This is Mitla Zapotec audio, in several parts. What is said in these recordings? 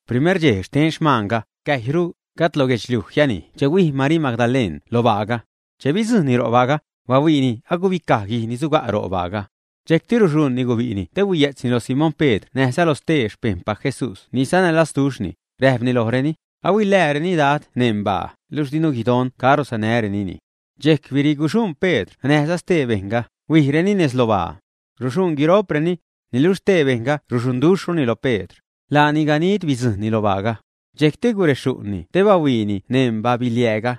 Primer dxej xten xmaanga, cäjyru, gajd lo guedxliuj jianij che huij Marii Magdaleṉ lo baaga. Che bidzujṉni ro' baaga, bahuiini agubicaj guij ni suga' ro' baaga. Dxejcti ruxuṉni gubi'ni te huiye'tzni lo Simón Pedr näjza lo stee xpejṉpac Jesús ni sanälazduxhni, räjpni lojreni: ―Ahuilääreni Dad neṉ baa, luxh dinu guidon caro sanärenini. Dxejc biriguxuṉ Pedr näjza stee bejṉga, huijreni nez lo baa. Ruxuṉ guiro'preni. Niluxh stee bejṉga ruxuṉduxhruni loj Pedr. Laani ganid bidzujṉni lo baaga. Dxejcti guretäṉni te bahuiini neṉ ba-biliääga.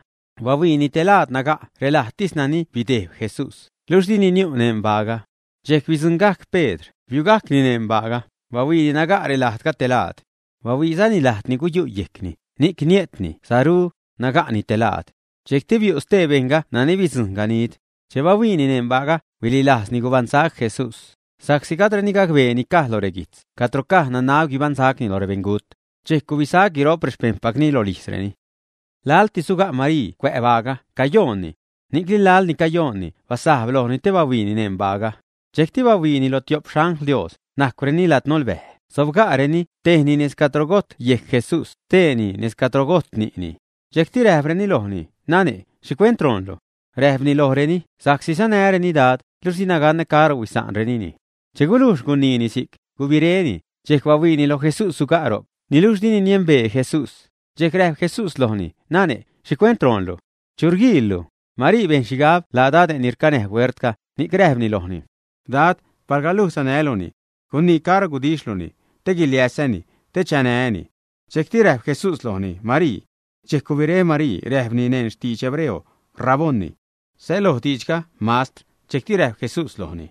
Bahuiini te laad naga' relajdtis nani bidejb Jesús, luxh dini niu' neṉ baaga. Dxejc bidzuṉgajc Pedr, biugajcni neṉ baaga, bahuiini naga' relajdga te laad. Bahuiizani lajd ni guyu' yejcni, ni'c nie'tni saru, naga'ni te laad. Dxejcti biu' stee bejṉga nani bidzujṉ ganid. Che bahuiini neṉ baaga, huililajzni gubaṉsac Jesús. Sa'csi gajdreni gacbee ni caj lo reguijtz, cadro caj nanab guibaṉsacni loj rebeṉgut. Dxejc gubisac guiro'p rexpejṉpacni rolijzreni. Laltis suga' Marii cuä' baaga, cayoonni. Ni'cni laḻ ni cayoonni, basajb lojni te bahuiini neṉ baaga. Dxejcti bahuiini lo tio'p xangl Dios, najcwreni ladnolbäj, sobga'reni, tejni nez cadro gojt yejc Jesús, steeni nez cadro gojt ni'ni. Dxejcti räjpreni lojni: ―Nane', ¿xhicuent roonlu? Räjpni lojreni: ―Sa'csi sanäreni Dad, luxh dina ganä caro huisa'nrenini. Che gulujx guniini si'c, gubiréni, dxejc bahuiini loj Jesús suga' ro'c, niluxh dini niembee Jesús. Dxejc räjp Jesús lojni: ―Nane', ¿xhicuent roonlu? ¿Chu rguiillu? Marii bejn xhigab laa dade' ni rcanäj huertga, ni'c räjpni lojni: ―Dad, palga luj sanäluni, gunii caro gudixhluni te guiliäsä́ni te chanää́ni. Dxejcti räjp Jesús lojni: ―¡Marii! Dxejc gubiré Marii, räjpni neṉ xtidx hebreo: ―¡Raboni! (Säloj diidxga “Mastr”.) Dxejcti räjp Jesús lojni: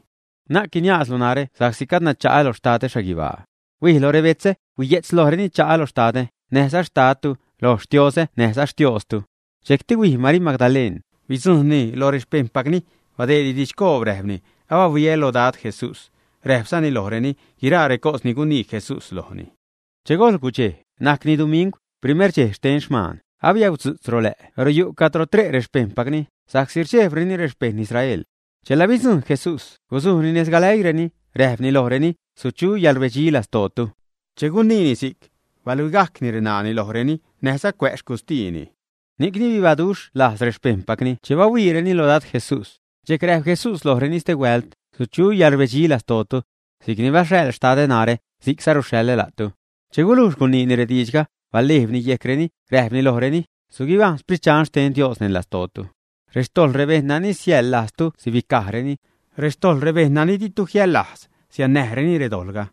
―Na'c guiniaazlu narä sa'csi gadna cha'a lo Xtadä xhaguibaa. Huij loj rebetzä, huiye'tz lojreni, cha'a lo Xtadä, näjza Xtadtu, loj Xtiozä näjza Xtiooztu. Dxejcti huij Marii Magdaleṉ, bidzujṉni loj rexpejṉpacni badeedni didxcoob, räjpni: ―Abahuiä lo Dad Jesús. Räjpzani lojreni guiraa recos ni gunii Jesús lojni. Che gojl gudxej, najcni dumingw, primer dxej xten xmaan, abiäudzu'tz ro lä' ro' yu' cadro tre' rexpejṉpacni, sa'csi rdxejbreni rexpejṉ Israel. Chela bidzujṉ Jesús, guzujni nez galäiireni, räjpni lojreni: ―Suchu yäḻrbedxi lastootu. Che guniini si'c, baluigajcni reṉaani lojreni näjza cuä' xcustiini. Ni'cni bibaduxhlajz rexpejṉpacni che bahuiireni lo Dad Jesús. Dxejc räjp Jesús lojreni stehuält: ―Suchu yäḻrbedxi lastootu. Si'c ni baxhaḻ Xtadä narä, si'cza ruxhaḻä la'tu. Che gulujx guniini rediidxga, balejbni yejcreni, räjpni, lojreni: ―Suguibajṉ Sprit Dxan xten Dios neṉ lastootu. Rextojḻ rebejṉ nani siäḻlajztu, sibicajreni. Rextojḻ rebejṉ nani ditu jiäḻlajz, siannäjreni redojḻga.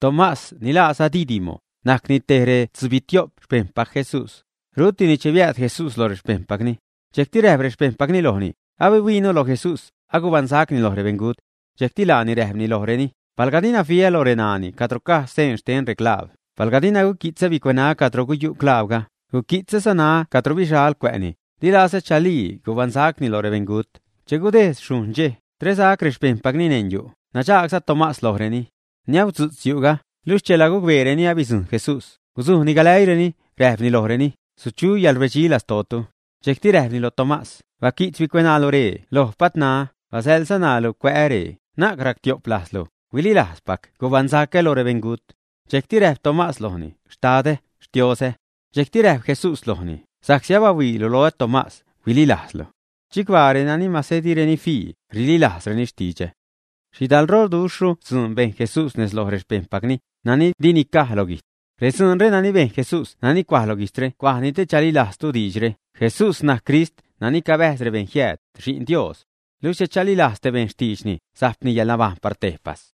Tomás, ni laaza Didimo, najcni te retzubitio'p xpejṉpac Jesús. Rutini che biääd Jesús loj rexpejṉpacni. Dxejcti räjp rexpejṉpacni lojni: ―Abihuiinu loj Jesús, agubaṉsacni loj rebeṉgut. Dxejcti laani räjpni lojreni: ―Palga dina fiä loj reṉaani cadro caj seen xten reclaab, palga dina guqui'tzä bicueṉaä́ cadro guyu' claabga, guqui'tzäza ṉaa cadro bixal cuä'ni, di lazä chalii gubaṉsacni loj rebeṉgut. Che gudejd xhujṉ dxej, tresac rexpejṉpacni neṉ yu', nadxaagza Tomás lojreni. Niäudzu'tz yu'ga, luxh chela gucbeereni abidzujṉ Jesús, guzujni galäiireni, räjpni lojreni: ―Suchu yäḻrbedxi lastootu. Dxejcti räjpni loj Tomás: ―Baqui'tz bicueṉaalu ree loj patṉaä, basäḻza ṉaalu cuä'äre, na'c ractio'p lajzlu, huililajzpac gubaṉsacä loj rebeṉgut. Dxejcti räjp Tomás lojni: ―¡Xtadä, Xtioozä! Dxejcti räjp Jesús lojni: ―Sa'csi abahuiilu loä, Tomás, huililajzlu. Chicbaa renani mase direni fii, rililajzreni xtidxä. Xhidalroduxhru dzuun bejn Jesús nez loj rexpejṉpacni, nani di nicaj lo guijtz. Redzuunre nani bejn Jesús nani cuaj lo guijtzre cuajni te chalilajztu diidxre: Jesús najc Crist, nani cabäjz rebejṉ jiääd, Xi'n Dios. Luxh che chalilajz te bejṉ xtiidxni, sajpni yäḻnabajṉ par tejpas.